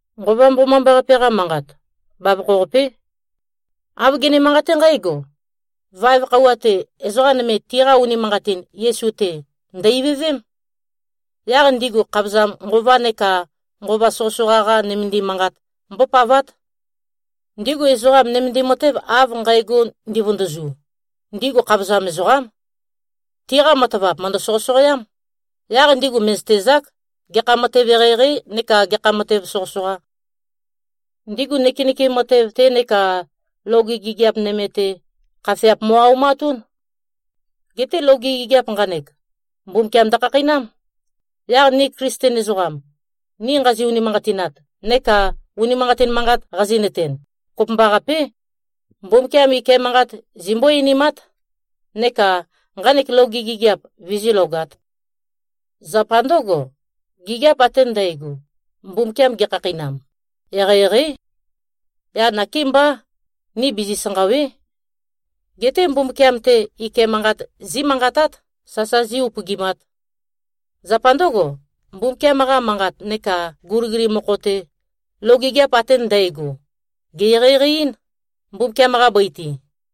Nqova Mbomambaqape-qa manqat, bavokho-qapé. Āv gene-manqaté nqǽgo: Vaev khøuwa-te, ezoqa nøme tiqa unimanqatin Yesu-te, ndø̀-ivøvém. Yaq ndigu khavozam nqova neka nqova soqøsoqa-qa nømendim manqat mbópavát. Ndigu ezoqam, nømendim matev av nqægo ndivøndøzu, ndigu khavozam ezoqám. Tiqa matavap mø̀ndø-soqøsoqoám, yaq ndigu mè꞉zøtezák, gekha matev eqeieqei neka gekha matev soqøsoqa. Ndigu nøkenøkem matev-te neka loge gigiap nøme-te, khafeap mo꞉-aumatún. Geté loge gigiap nqanek, Mbumbukiam ndøkhakheinám. Yaq ni Klisten ezoqam, ni nqazi-unimanqatinat neka unimanqatin manqat qazi꞉nøten, kopømbaqapé, Mbumbukiam ike manqat zimbó-einimát, neka nqanek loge gigiap vizílogāt. Zapa ndǿgo, gigiap ate ndægo, Mbumbukiam gekhakheinam, eqeieqeí. Yaq nakémbá, ni bizi-sanqàwe᷄. Geté Mbumbukiam-te ike manqat zímanqatát, sasa zí-upøgimāt. Zapa ndǿgo, Mbumbukiam-qa Manqat neka guligulim mokho-te, loge gigiap ate ndægo, gè-eqeieqei-ín, Mbumbukiam-qa bøi-te.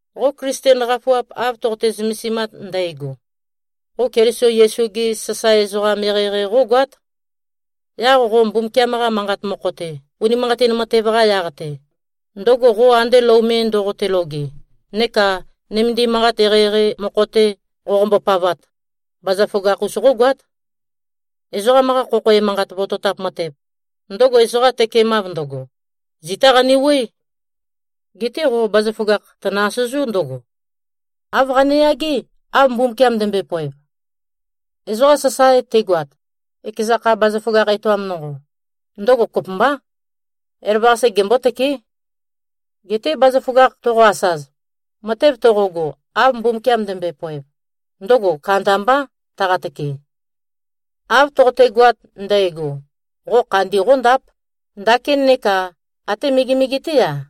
Qo Klisten qafuap av toqote-zømesimat ndægo, qo Keliso Yesu-ge sasae ezoqam eqeieqei qógoát. Yaq qo Mbumbukiam-qa Manqat mokho-te, unimanqatin matev-qa yaq-te, ndøgo qo ande lou me ndoqote-loge, neka nømendim manqat eqeieqei mokho-te, qoqombo-pavat, bazaføgakh-us qógoát. Ezoqam-qa khokho emanqat vototap matev, ndøgo ezoqa tøkemav ndøgo, zitá qanewuøé. Geté qo bazaføgakh tønø-asøzú ndǿgo: Āv qane-yagé, av Mbumbukiam ndømbøe-poev. Ezoqa sasae tegoat, ekeza kha bazaføgakh etoam nonqo, ndøgo kopømbá. Elavøqase gembótøké. Geté bazaføgakh toqo-asaz, matev toqogo, av Mbumbukiam ndømbøe-poev, ndøgo kandambá tøqatøke. Av toqotegoat ndægo, qo khandi qóndáp, ndakín neka até megemege-té-a.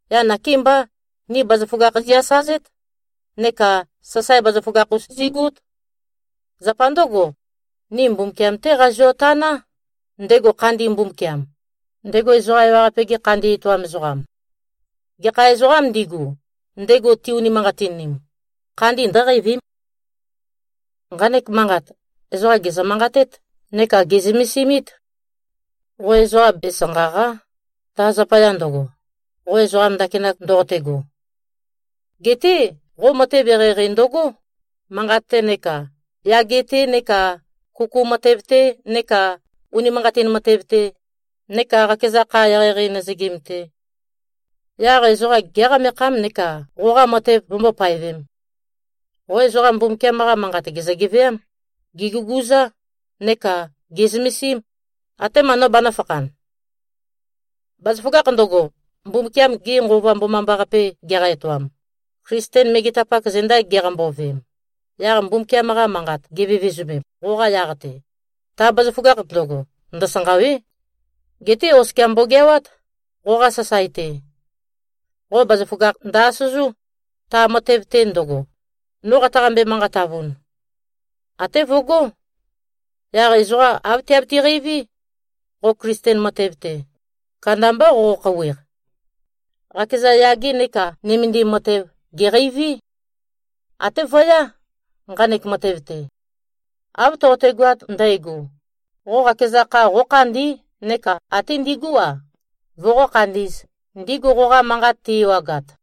Yaq nakémbá, ni bazaføgakh zi-asazét neka sasae bazaføgakh-us zigút. Zapa ndǿgo, ni Mbumbukiam-té qazio-taná, ndego khandi Mbumbukiam, ndego ezoqa ewaqape-ge khandi etoam ezoqam. Gekha ezoqām ndigu, ndego ti-unimanqatinim, khandi ndǿqeivím. Nqanek manqat, ezoqa gèzø-manqatét neka gè꞉zømesimít. Qo ezoqa besanqàqa᷄, ta zapaya ndøgo, qo ezoqam ndakinak ndoqotego. Geté qo matev eqeieqei ndøgó, manqat-te neka yage-te neka kuku matev-te neka unimanqatin matev-te neka qakeza kha eqeieqei nøzøgim-te. Yaq ezoqa géqamekhám, neka qoqa matev vømbó-paevēm. Qo ezoqa Mbumbukiam-qa Manqat gèzø-geveám. Gèguguzá, neka gè꞉zømesím, atema no banø̄fakhan. Bazaføgakh ndøgo, Mbumbukiam-ge Nqova Mbomambaqape geqa-etoam, Klisten megetapak zenda giqambo-veem, yaq Mbumbukiam-qa manqat givevezømem qoqa yaq-te, ta bazaføgakh ndøgo, ndøsanqàwe᷄. Geté oskia mbogeawát, qoqa sasae-te. Qo bazaføgakh ndø-asøzú, ta matev-te ndøgo, no qataqambe-manqatavun. Até vøgó. Yaq ezoqa āv tiabiti-qeiví: Qo Klisten matev-te, kandambá qoqo-khouweq. Qakeza yage neka nømendim matev, gèqeiví. Até vøyá, nqanek matev-te. Av toqotegoat ndægo, qo qakeza kha qókhandí neka até ndigú-a, voqó-khandī꞉z, ndigu qoqa manqat ti-ewagat.